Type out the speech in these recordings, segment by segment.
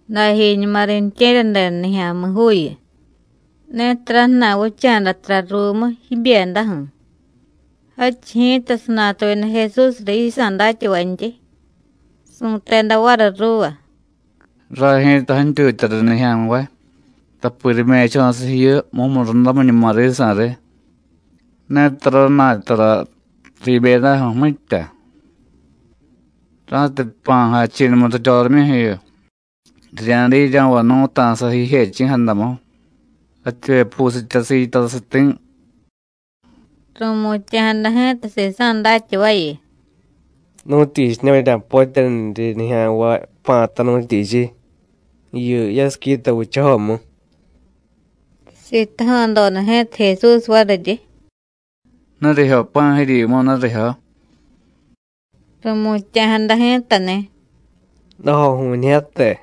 Dajiñuma riintye̱ryadeda nijya̱mi̱juuyu, netara jna̱y vicha̱da tara ruumu jibyedaju̱. Jadchiy ji̱ta sanatuyada Jesús riy yisa̱ datyavantyi, su̱teda variy ruuva: “Ray ji̱ta jantyutya riy nijya̱nvay, tapi rime̱cho̱siy jiyu mumurundamiñuma risa̱ riy, netara jna̱y tara riibyedaju̱, mitya. Ra̱tiy jpa̱ jachi̱numu riryorimyuju̱yu, rirya̱diiryo̱vay nu̱ta̱sa jijechi̱jadamu, jativyepusitya sitasiy ti̱.” Ru̱mutya̱jada ji̱ta sisa̱ datyavayu: “¿Nu̱tyichiña̱ vurya̱potyaniryi nijya̱nvay pa̱ta, nu̱tyichiy? jiyu yasiquita vichajomu.” Sitaja̱doda ji̱ta Jesús variryi: “¿Nurijyo pa̱ jiryimu, nurijyo?” Ru̱mutya̱jada ji̱tani̱: “Dajoju̱ñijyate.”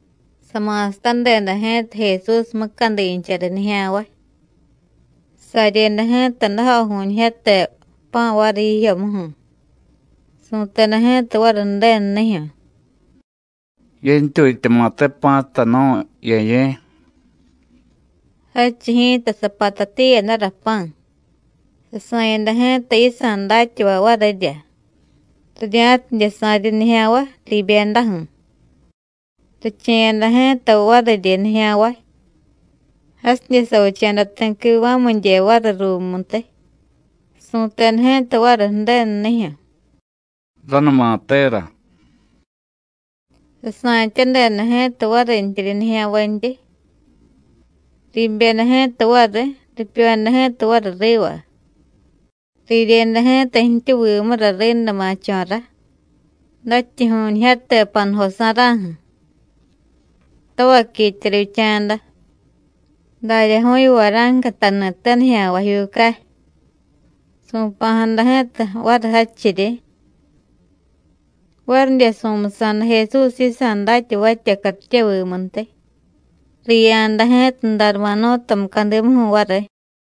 Sama̱satadeda ji̱ta Jesús mucadincha riy nijya̱nvay. Saryeda ji̱ta dajoju̱ñijyate pa̱ variy jijyomuju̱, su̱teda ji̱ta variy Ju̱denunijyu̱: “Yentyutyama̱te pa̱ta nu̱y, Ye̱ye̱.” Jadchiy ji̱ta sapatatiyadara pa̱, sasa̱yada ji̱ta yisa̱ datyavay varirya, rirya̱tidye sa̱ryi nijya̱nvay riibyedaju̱; riche̱yada ji̱ta variryi nijya̱nvay. Jasidye savicha̱da ti̱ quiva̱midye variy ruumuntiy, su̱teda ji̱ta variy Ju̱denunijyu̱: “Ranumatera.” Sasa̱tyadeda ji̱ta varintyiryi nijya̱nvantyi. Riibyeda ji̱ta variy, ripyoyada ji̱ta variy riva. Riryeda ji̱ta jtyuvimura riinda ma̱cho̱rá, dajtyuju̱ñijyate panujo sa̱ra̱ju̱. Tavaquitya rivyicha̱da, daryaju̱yu vara̱nca jtani̱te nijya̱mi̱juucay. Su̱pa̱jada ji̱ta variy jadchiryi. Varidye su̱musa̱da Jesús yisa̱ datyavatya cartyevimuntiy, riya̱da ji̱ta Darmanú̱ta mucadimuju̱ variy.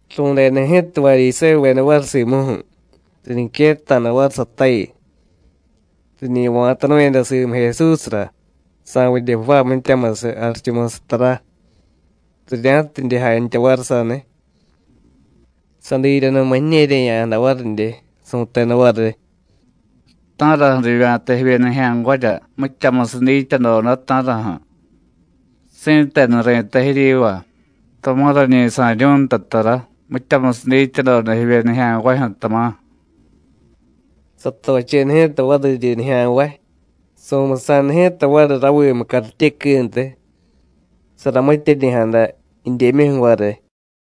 Ru̱deda ji̱ta Varyisévuveda variy simuju̱, riñiquetta̱da variy satayu. Riñi va̱tanu̱yada simu Jesúsra, sa̱vidye jvaay mityamusiy jarichumusiy tara, rirya̱tidye jantya variy saniy. Sadiryanuma jiñe̱rye̱ya̱jada varidye, su̱teda variy: “¿Ta̱raju̱ rivya̱ta jivye nijya̱nvarya mityamusiy dityadoda, ta̱raju̱? Si̱tenu ri̱tay jiryiva: Tama̱ rañi sa̱ryu̱y nta tara mityamusiy dityadoda jivye nijya̱nvajyu̱, tama̱.” Satocheda ji̱ta variryi nijya̱nvay, su̱musa̱da ji̱ta variy ravimu cartyequiintiy, saramityeryi̱jada jidyemyuju̱ variy.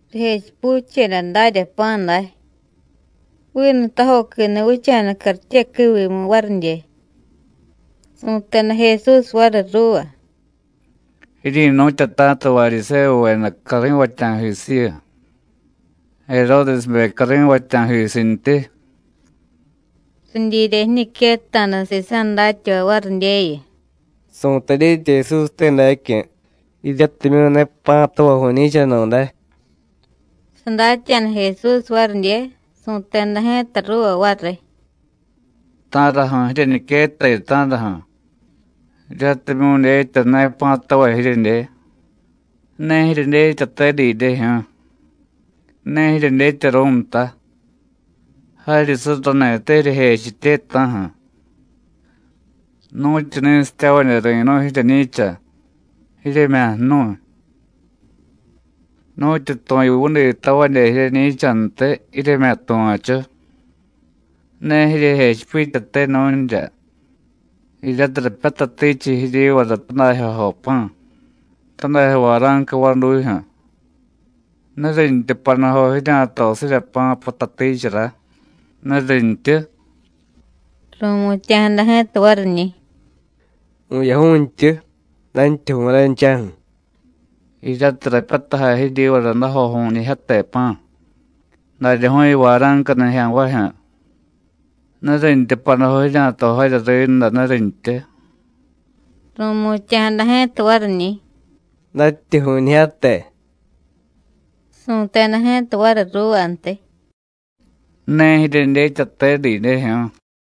Rijechipucheda darya pa̱ day, vinu tajoquini̱ vicha̱da cartyequiivimu varidye. Su̱teda Jesús variy ruuva: “Jiryi̱nu̱tyata̱ta Varyisévuveda cari̱vatya̱jisiyu, Jeródesbe cari̱vatya̱jisintyi.” Ridyirya jiñiquetta̱da sisa̱ datyavay varidyeyu: “Su̱tay dyetya Jesúste dacyu̱, jiryatimyu̱ ne pa̱tavay vu̱ñi̱chanu̱day.” Sadatya̱da Jesús varidye, su̱teda ji̱ta ruuva variy: “¿Ta̱raju̱ jiryeñiquettayu, ta̱raju̱? jiryatimyu̱ dyetya ne pa̱tavay jiryedye. ¿Ne jiryedyetyate didyejyu̱ú̱? ¿Ne jiryedyetyaru̱y nta? ¡Jaryi surrani̱te jiryejechitye ta̱ju̱! ¡Nu̱tyu ni̱sityavadye ri̱nu̱y jiryeñi̱cha, jiryemya̱ jnu̱y! ¡Nu̱tyu tu̱yuvuditavadye jiryeñi̱chantiy, jiryemya̱ tuva̱chu! ¿Ne jiryejechipityate nu̱nrya, jiryatiy rapyatatichiy jiryivara tadajyojo pa̱, tadajyo vara̱nca vadujyu̱? ¿Nurintyu panujo jirya̱tosirya pa̱ patatichara, nurintyu?” Ru̱mutya̱jada ji̱ta variñi̱: “Vu̱yaju̱jtyu, dajtyuju̱y ranchaju̱.” “Jiryatiy rapyatajay jiryivara dajoju̱ñijyate pa̱, daryaju̱yu vara̱nca nijya̱nvajyu̱, ¿nurintyu panujo jirya̱tojarya rínda, nurintyu?” Ru̱mutya̱jada ji̱ta variñi̱: “Dajtyuju̱ñijyate.” Su̱teda ji̱ta variy ruuvantiy: “¿Ne jiryedyetyate didyejyu̱ú̱?”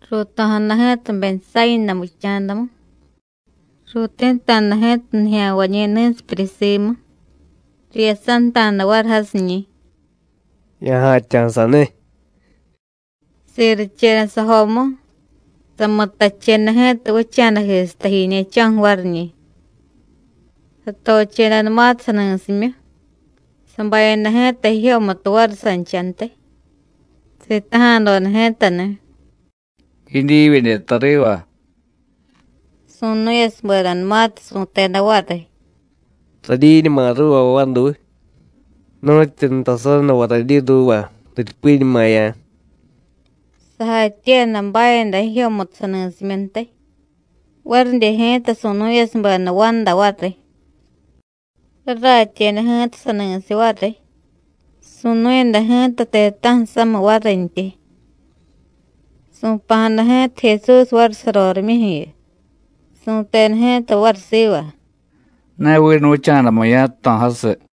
Ruuto̱jada ji̱ta Betsáyina vicha̱damu. Ruuti̱ta̱da ji̱ta nijya̱nvañi̱ ni̱sipyuryi simu, riyasanta̱da variy jasiñi̱: “Ya̱ja̱tya̱ saniy.” Siricheda sajomu, samutacheda ji̱ta vicha̱dajisiy tajiñe̱cho̱ju̱ variñi̱. Satochedanumatiy sani̱simyu, sabayada ji̱tara jijyomutu variy sanchantiy; sitaja̱doda ji̱tani̱: “¿Jidyi vidye tariva?” Su̱nu̱yasubedanumatiy su̱teda variy: “Radyiñuma ruuva vaduy, nu̱tyu nutasaranuva radyi ruuva, riryupiñumaya̱.” Sajatyiiyada bayada jijyomutu sani̱simyuntiy, varidye ji̱ta su̱nu̱yasubeda vanda variy. Raratyeda ji̱ta sani̱siy variy, su̱nu̱yada ji̱ta ti̱ta̱ju̱ samiy varintyi. Su̱pa̱jada ji̱ta Jesús variy sarorimyuju̱yu, su̱teda ji̱ta variy siva: “Ne vinu vicha̱damu ya̱jto̱jasiy.”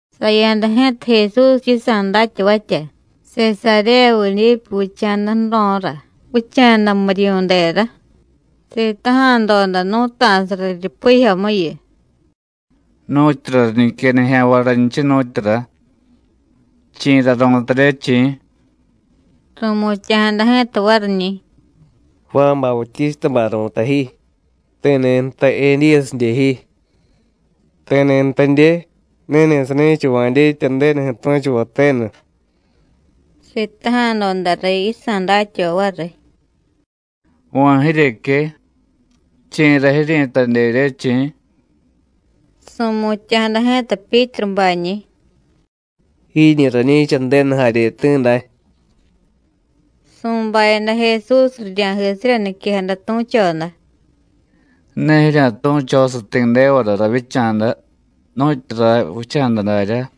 Saya̱da ji̱ta Jesús yisa̱ datyavatya, Sesaréya Vidípu vicha̱da ju̱ro̱ra vicha̱da muriyu̱dera. Sitaja̱doda nú̱ta̱sa riryupijyomuyu: “¿Nu̱tyura riñique nijya̱nvay raynchiy, nu̱tyura? ¿chi̱ra ru̱tarye, chi̱?” Ru̱mutya̱jada ji̱ta variñi̱: “Juán Bautístabay ru̱tay ji, ti̱ni̱ jtay: Edíyasidye ji, ti̱ni̱ jtadye: Ni̱ni̱ sani̱chava̱ dyetya Ju̱denuju̱ tu̱chuvay tenu.” Sitaja̱doda riy yisa̱ datyavay variy: “¿Va̱ jiryeque? ¿Chi̱ra jiryi̱tadyerye, chi̱?” Su̱mutya̱jada ji̱ta Pyítrubañi̱: “Jiñi̱ rañi̱cha Ju̱denu jaryeti̱ day.” Su̱bayada Jesús rirya̱jisirya niquejada tu̱choda: “Ne jirya̱tu̱chosiy ti̱devara ravyicha̱da, nu̱tyu ray vicha̱da daryá.”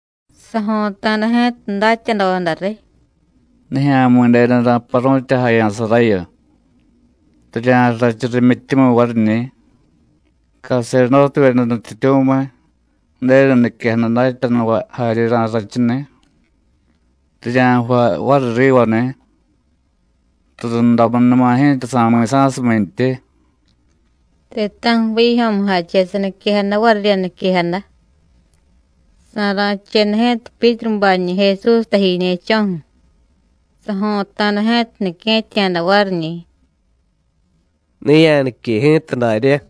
Sajo̱ta̱da ji̱ta datyadoda riy: “Nijya̱mi̱denu ra̱paru̱tyajaya̱sarayu. Rirya̱rrachu rimyityumiy variñi̱, caserdótevyeda nutyityu̱miy, Ju̱denu niquejada datyanuvay jarye ra̱rrachuni̱. Rirya̱jvay variy rivani̱, rurundamunuma ji̱ta sa̱mi̱sa̱sumintyi.” Ti̱ta̱ju̱ vijyo̱mujache saniquejada varirya niquejada. Sa̱ra̱cheda ji̱ta Pyítrubañi̱ Jesús tajiñe̱cho̱ju̱, sajo̱ta̱da ji̱ta nique̱tya̱da variñi̱: “Ne ya̱nique ji̱ta daryá.”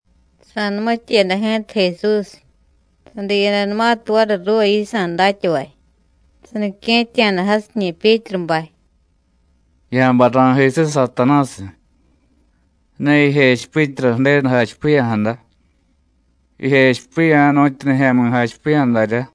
Sa̱numityeda ji̱ta Jesús, sadiyadanumatiy variy ruuva yisa̱ datyavay, sanique̱tya̱da jasiñi̱ Pyítrubay: “Ya̱bay ra̱jisiy, Satanásiy. Ne jijechipityara Ju̱denu jachipiya̱jada. Jijechipiya̱ nu̱tyu nijya̱mi̱ jachipiya̱ daryá.”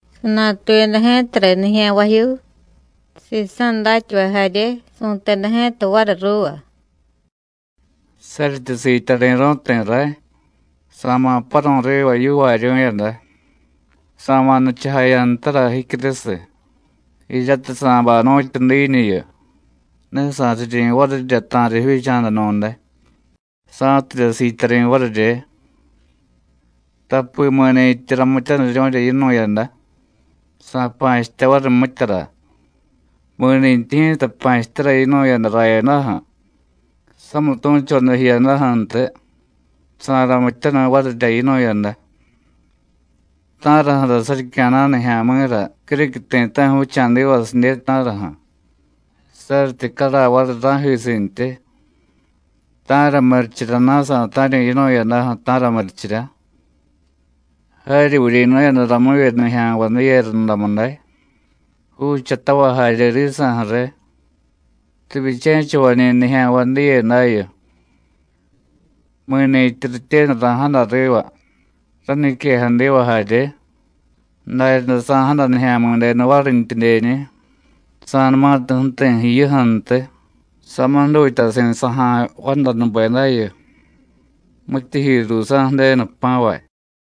Sanatuyada ji̱ta riy nijya̱nvajyuu, sisa̱ datyavay jarye, su̱teda ji̱ta variy ruuva: “Saryityi siityari̱ru̱y ti̱ ray, sa̱ma̱ paru̱y riva yivaaryu̱yada, sa̱ma̱ nichujaya̱ ntara jicyurusiy, jiryatiy sa̱bay nu̱tyu diiñuyu, ne sa̱riryi̱ varirya ta̱riy jivyicha̱danu̱day, sa̱tidye siityari̱ varirye. Tapi mi̱ni̱tyi ramityaniryu̱rya yinu̱yada, sa̱pa̱chitya variy mityara; mi̱nintyi ji̱ta pa̱chityara yinu̱yada rayadaju̱, samitu̱choda jiyadaju̱ntiy, sa̱ramityaniy varirya yinu̱yada. ¿Ta̱raju̱ra saryicya̱na̱y nijya̱mi̱ra criquiy ti̱ta̱ju̱ vicha̱divasidye, ta̱raju̱? saryityi caray variy ra̱jisintyi. ¿Ta̱ra murichiryana̱ sa̱ta̱ryu̱y yinu̱yadaju̱, ta̱ra murichirya? Jaryi vuryi̱nu̱yada ramuvye nijya̱nvay diye rundamu day, juuchatavay jarye risa̱ju̱ riy. Rivyiche̱chavañi̱ nijya̱nvay diye dayu. Mi̱ni̱tyi rityenu ra̱jada riva, rañiquejadiva jarye, daryaday sa̱jada Nijya̱mi̱denu varintyidyeñi̱, sa̱numatiy ju̱ti̱ jiyuju̱ntiy, samiy jdutyasi̱ saja̱y vandanubedayu, mityijyi ruusa̱ Ju̱denu jpa̱vay.”